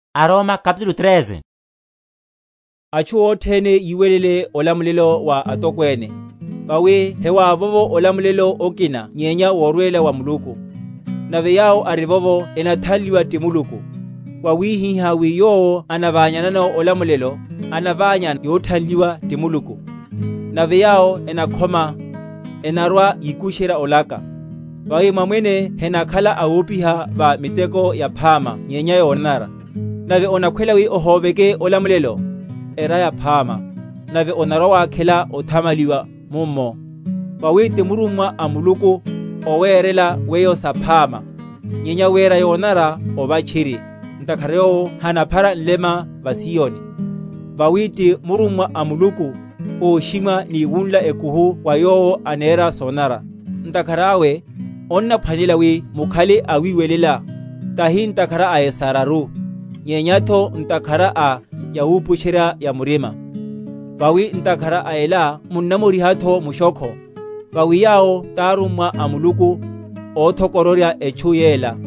Walapa wahu atokwene. Atchu othene yiwelele olamulela wa atokwene; vawi hewavovo olamulela okina nyenya worwela wa Muluku; nave yawo arivovo enathanliwa ti Muluku. Wawihihá wi yowo anaványanano olamulelo, anaványa yothanliwa ti Muluku; nave yawo enakhoma, enarwa‐yikusherya olaka. Vawi mamwene henakhala awopiha va miteko yaphama nyenya yonanara. Nave onakhwela wi ohóveke olamulelo? Era yaphama, nave onarwa‐wakhela othamaliwa mummo; vawi ti murummwa a Muluku, owerela weyo saphama. Nyenya wera yonanara, ova tchiri, ntakhara yowo hanaphara nlema va siyoni; vawi ti murummwa a Muluku óshimwa ni wunla ekuhu va yowo anera sonanara. Ntakhara awe, onnaphwanelela wi mukhale awiwelela, tahi ntakhara a esararu, nyenyatho ntakhara a yawupusherya‐ya‐murima. Vawi ntakhara a ela munnamorihatho mushokho; vawi yawo tarummwa a Muluku, óthokororyaru etchu yela.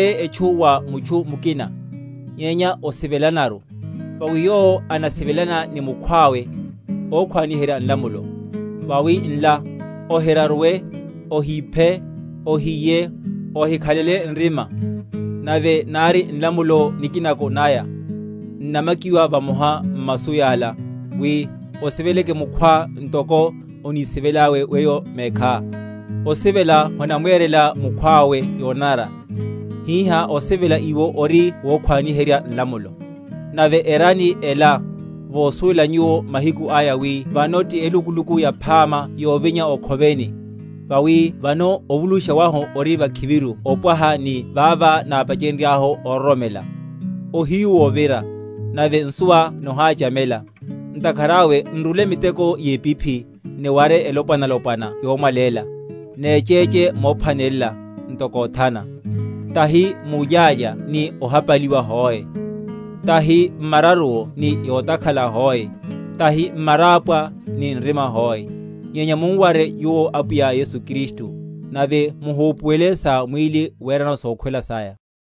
Muhipoleye etchu wa mutchu mukina, nyenya osivelanaru; vawi yowo anasivelana ni mukhwawe ókhwaniherya nlamulo. Vawi nla, Ohiraruwe, Ohiphe, Ohiye, Ohikhalele nrima, nave nari nlamulo nikinako naya, n’namakiwa vamoha m’masu yala, wi. Osiveleke mukhwá ntoko onisivelelá weyo mekhá. Osivela honamwerela mukhwawe yonanara; hihá osivela iwo ori wokhwaniherya nlamulo. Nave erani ela, vosuwela nyuwo mahiku aya, wi vano ti elukuluku yaphama yovinya o’khoveni; vawi vano ovulushiwa wahu ori vakhiviru opwaha ni vavá nápachenryahu ororomela. Ohiyu wovira, nave nsuwa noháchamela; ntakhara awe n’rule miteko yepiphi, niware elopwanalopwana yomwaléla. Nechéche mophwanelela, ntoko othana; tahi mulyálya ni ohapaliwa hoe, tahi m’mararuwo ni yotakhala hoe, tahi m’marapwa ni nrima hoe. Nyenya mum’ware nyuwo Apwiya Yesu Kristu, nave muhupuwelele sa mwíli werano sokhwela saya.